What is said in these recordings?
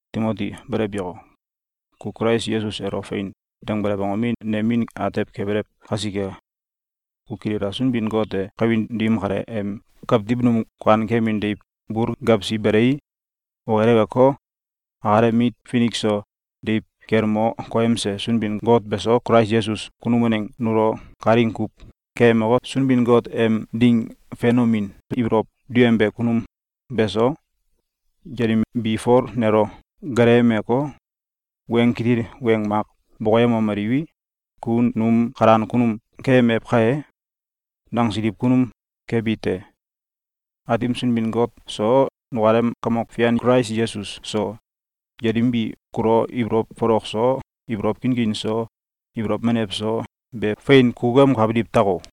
Timoti, belew yako! Ku Kulais Yesus elo “Fein!”, dangbelew angomi, nem min atew kebelew kasike. Ku kilila! Sunbin-Got e kawin dim kale em kawtiw num kuankemin deiw bul gewsi belei, okileweko, akalem mit finik so deiw kel mo koyemse Sunbin-Got beso, Kulais Yesus kunum waneng nulo kalaing kuw keyemeko, Sunbin-Got em ding fenomin ibolow duyembe kunum beso, yelim bi Fol nelo gaanemeko, weng kitil weng mak bokonemomeliw: “Ku num kalan kunum keyemew kai!”, nangsiliw kunum kebi te. Aatim Sunbin-Got so, nukalem Kamok Fian Kulais Yesus so, yelim bi kulo ibolow folok so, ibolow kinkin so, ibolow menew so be fein kukukemkabiliw tako!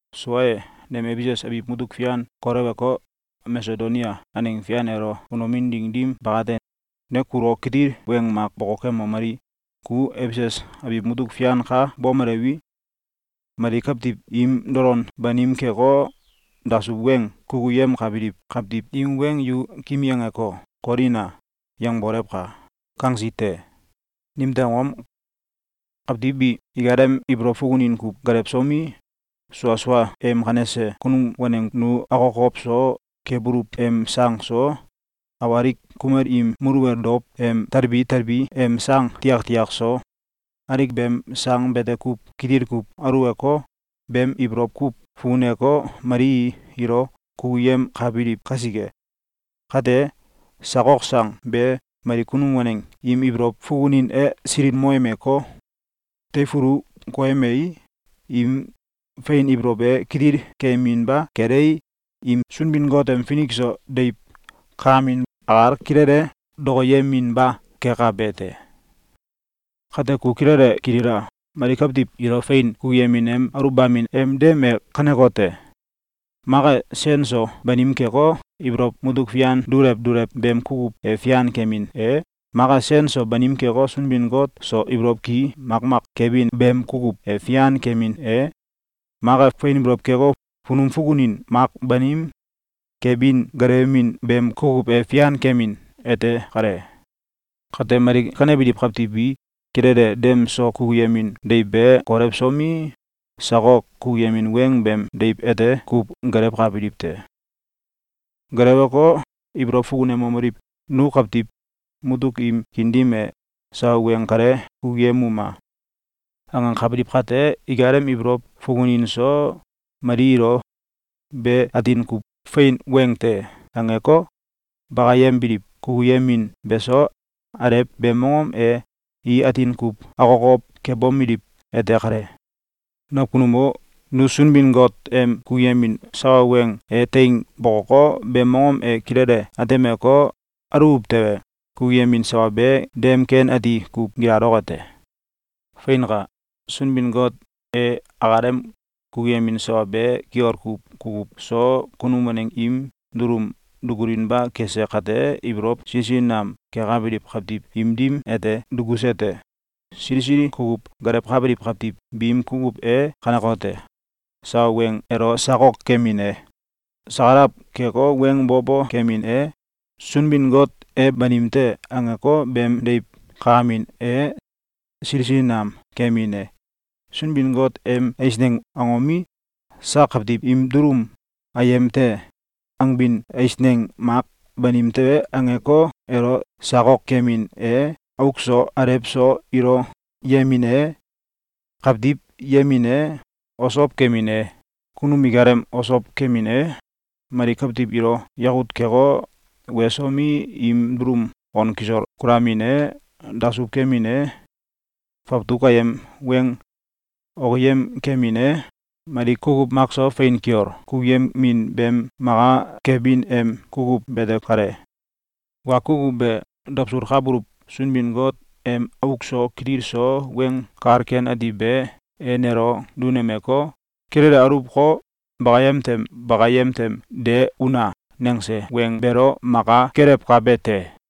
Sua e, nem Efesus abiw mutuk fian kolewko, Masedonia aneng fian elo unomin ding dim bakate, ne kulo kitil weng mak bokokemomeli: “Ku Efesus abiw mutuk fian ka bomelewi, mali kawtiw im dolon banim keko, dasuw weng kukuyemkabiliw kawtiw im weng ‘Yu kimi angeko, kolina!’, yangbolewka!”, kangsi te. Nimtew angom? Kawtiw bi ikalem ibolow fukunin kuw gelewsomi, sua sua em kanese kunum waneng nu akokow so kebuluw em sang so, awalik kumel im muluwel dow em telbi telbi em sang tiaktiak so, alik beem sang bete kuw kitil kuw aluwko, beem ibolow kuw fukuneko, mali ilo kukuyemkabiliw kasike. Kate, sakok sang be mali kunum waneng im ibolow fukunin e silimoyemeko, teifulu koyemei, im fein ibolow e kitil keyeminba kelei, im Sunbin-Got em finik so deiw kakamin akal kilele dokoyeminba kekabe te. Kate, ku kilele kilila! Mali kawtiw ilo fein kukuyemin em aluwbamin em dem e kanekote: Mak e, sen so banim keko, ibolow mutuk fian dulew dulew beem kukuw e fian kemin e, mak e, sen so banim keko, Sunbin-Got so ibolow ki makmak kebin beem kukuw e fian kemin e, mak e, fein ibolow keko, funum fukunin mak banim kebin gelewemin beem kukuw e fian kemin ete kale. Kate, mali kanebiliw kawtiw bi kilele dem so kukuyemin deiw be kolewsomi, sakok kukuyemin weng beem deiw ete kuw gelewkabiliw te. Gelewko, ibolow fukunomeliw: “Nu kawtiw mutuk im kiin dim e sawa weng kale kukuyemuma!”, angakabiliw kate, ikalem ibolow fukunin so, mali ilo “Be atin kuw fein weng te!”, angeko, bakayembiliw kukuyemin beso, alew beem mongom e i atin kuw akokow kebomeliw ete kale. Nakunum o! Nu Sunbin-Got em kukuyemin sawa weng e teing bokoko, beem mongom e kilele atemeko, aluw tewe, kukuyemin sawa be dem ken ati kuw gilaloke te. Feinka! Sunbin-Got e akalem kukuyemin sawa be kiol kuw kukuw so kunum waneng im dulum dukulinba kese kate, ibolow sili sili nam kekabiliw kawtiw im dim ete dukuse te. Sili sili kukuw gelewkabiliw kawtiw biim kukuw e kanekote: Sawa weng elo sakok kemin e, sakalaw keko, weng bo bo kemin e, “Sunbin-Got e banim te.”, angeko, beem deiw kakamin e, sili sili nam kemin e, Sunbin-Got em eisneng angomi, “Sak kawtiw im dulum ayem te!”, angbin eisneng mak “Banim te!”, angeko, elo sakok kemin e, auk so alew so ilo yemin e, kawtiw yemin e, osow kemin e, kunum ikalem osow kemin e, mali kawtiw ilo yakut keko, wesomi, im dulum on kisol kulamin e, dasuw kemin e, fawtuk ayem weng okiyem kemin e, mali kukuw makso, fein kiol kukuyemin beem maka kelewbin em kukuw bete kale. Wa kukuw be dawsulkabuluw Sunbin-Got em auk so kitil so Weng Kal Ken Ati be e nelo dunemeko, “Kilele aluwko, bakayem tem bakayem tem de una!”, nangse Weng beelo maka kelewkabe te.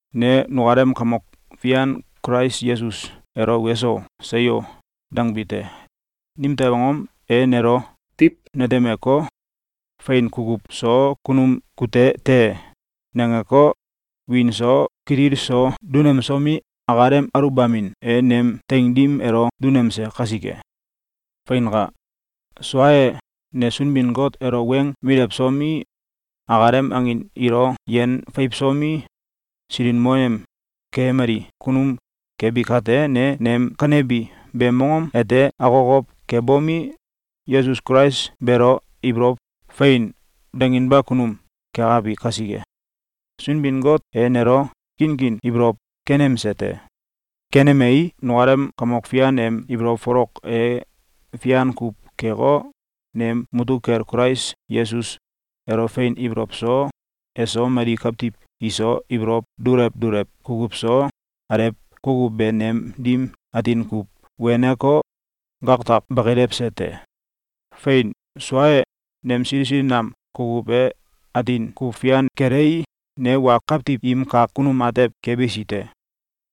Ne nukalem Kamok Fian Kulais Yesus elo “Weso! Seyo!”, dangbi te. Nimtew angom? E nelo diw netemeko, “Fein kukuw so kunum kute te!”, nangeko, wiin so kitil so dunemsomi, akalem aluwbamin e nem teing dim elo dunemse kasike. Feinka! Sua e, ne Sunbin-Got elo weng milewsomi, akalem angin ilo yen feiwsomi, silikmoyem keyemali kunum kebi kate, ne nem kanebi beem mongom ete akokow kebomi, Yesus Kulais beelo ibolow “Fein!”, danginba kunum kekabi kasike, Sunbin-Got e nelo kinkin ibolow kenemse te. Kenemei, nukalem Kamok Fian em ibolow folok e fian kuw keko, nem mutuk kel Kulais Yesus elo fein ibolow so, eso mali kawtiw iso ibolow dulew dulew kukuw so, alew kukuw be nem dim atin kuw weneko, gaktak bakilewse te. Fein! Sua e, nem sili sili nam kukuw e atin kuw fian kelei, ne wa kawtiw im kak kunum atew kebisi te.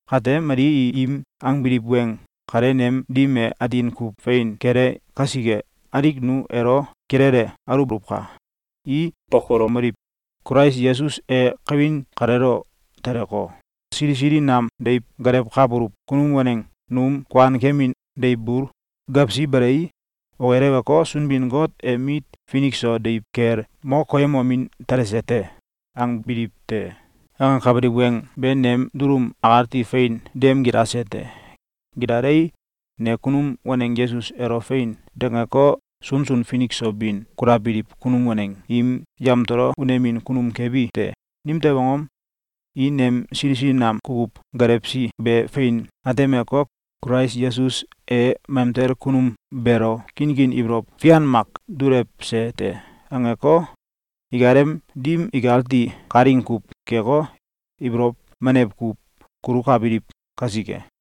Kate, mali im angbiliw weng kale nem dim e atin kuw fein kele kasike, alik nu elo kilele aluwboluwka! I bokolomeliw: “Kulais Yesus e kawin kaleelo teleko, sili sili nam deiw gelewkabuluw kunum waneng num kuankemin deiw bul gewsi belei, okileweko, Sunbin-Got em mit finik so deiw kel mo koyemomin telse te.”, angbiliw te. Angakabiliw weng be nem dulum akati fein dem gilase te. Gilalei, ne kunum waneng Yesus elo “Fein!”, dangeko, sunsun finik so bin kulabiliw kunum waneng im yamtolo unemin kunum kebi te. Nimtew angom? I nem sili sili nam kukuw gelewsi be fein atemeko, “Kulais Yesus e mamtel kunum beelo kinkin ibolow fian mak dulewse te!”, angeko, ikalem dim ikati kalaing kuw keko, ibolow menew kuw kulukabiliw kasike.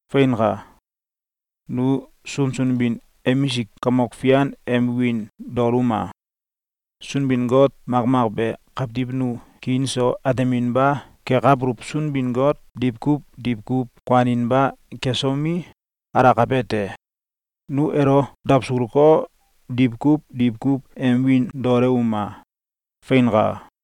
Feinka! Nu sunsun bin emisik Kamok Fian em wiin daoluma! Sunbin-Got makmak be kawtiw nu kiin so ateminba kekabuluw Sunbin-Got diwkuw diwkuw kuaninba kesomi, alakabe te. Nu elo Dawsulko, diwkuw diwkuw em wiin daolewuma! Feinka!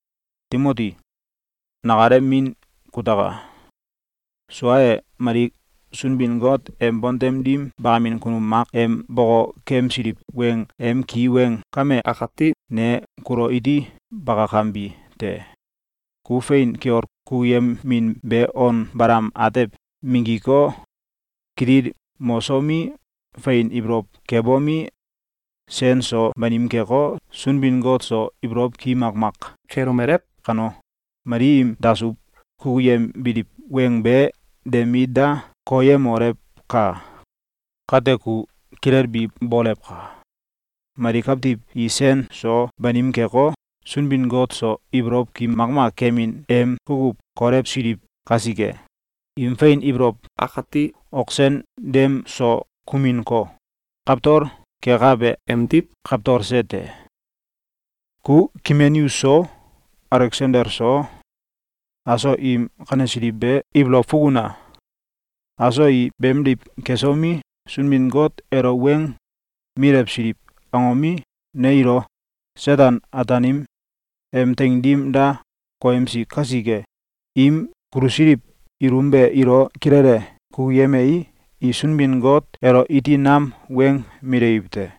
Timoti, nakalem min kutaka! Sua e, mali Sunbin-Got em bontem dim bakamin kunum mak em bokokemsiliw weng em ki weng kame akati ne kulo iti bakakembi te. Ku fein kiol kukuyemin be on balam atew minggiko, kitil mosomi, fein ibolow kebomi, sen so banim keko, Sunbin-Got so ibolow ki makmak kelomelew kano, mali im dasuw kukuyembiliw weng be de mit da koyemolewka! Kate ku kilelbi bolewka! Mali kawtiw i sen so banim keko, Sunbin-Got so ibolow ki makmak kemin em kukuw kolewsiliw kasike, im fein ibolow akati ok sen dem so kuminko, kawtol kekabe emdiw kawtolse te. Ku Kimeneus so Aleksandel so aso im kanesiliw be ibolow fukuna! Aso i beemdiw kesomi, Sunbin-Got elo weng milewsiliw angomi, ne ilo Seten-Ataanim em teing dim da koyemsi kasike, im kulusiliw ilum be ilo kilele kukuyemei, i Sunbin-Got elo iti nam weng milewiw te.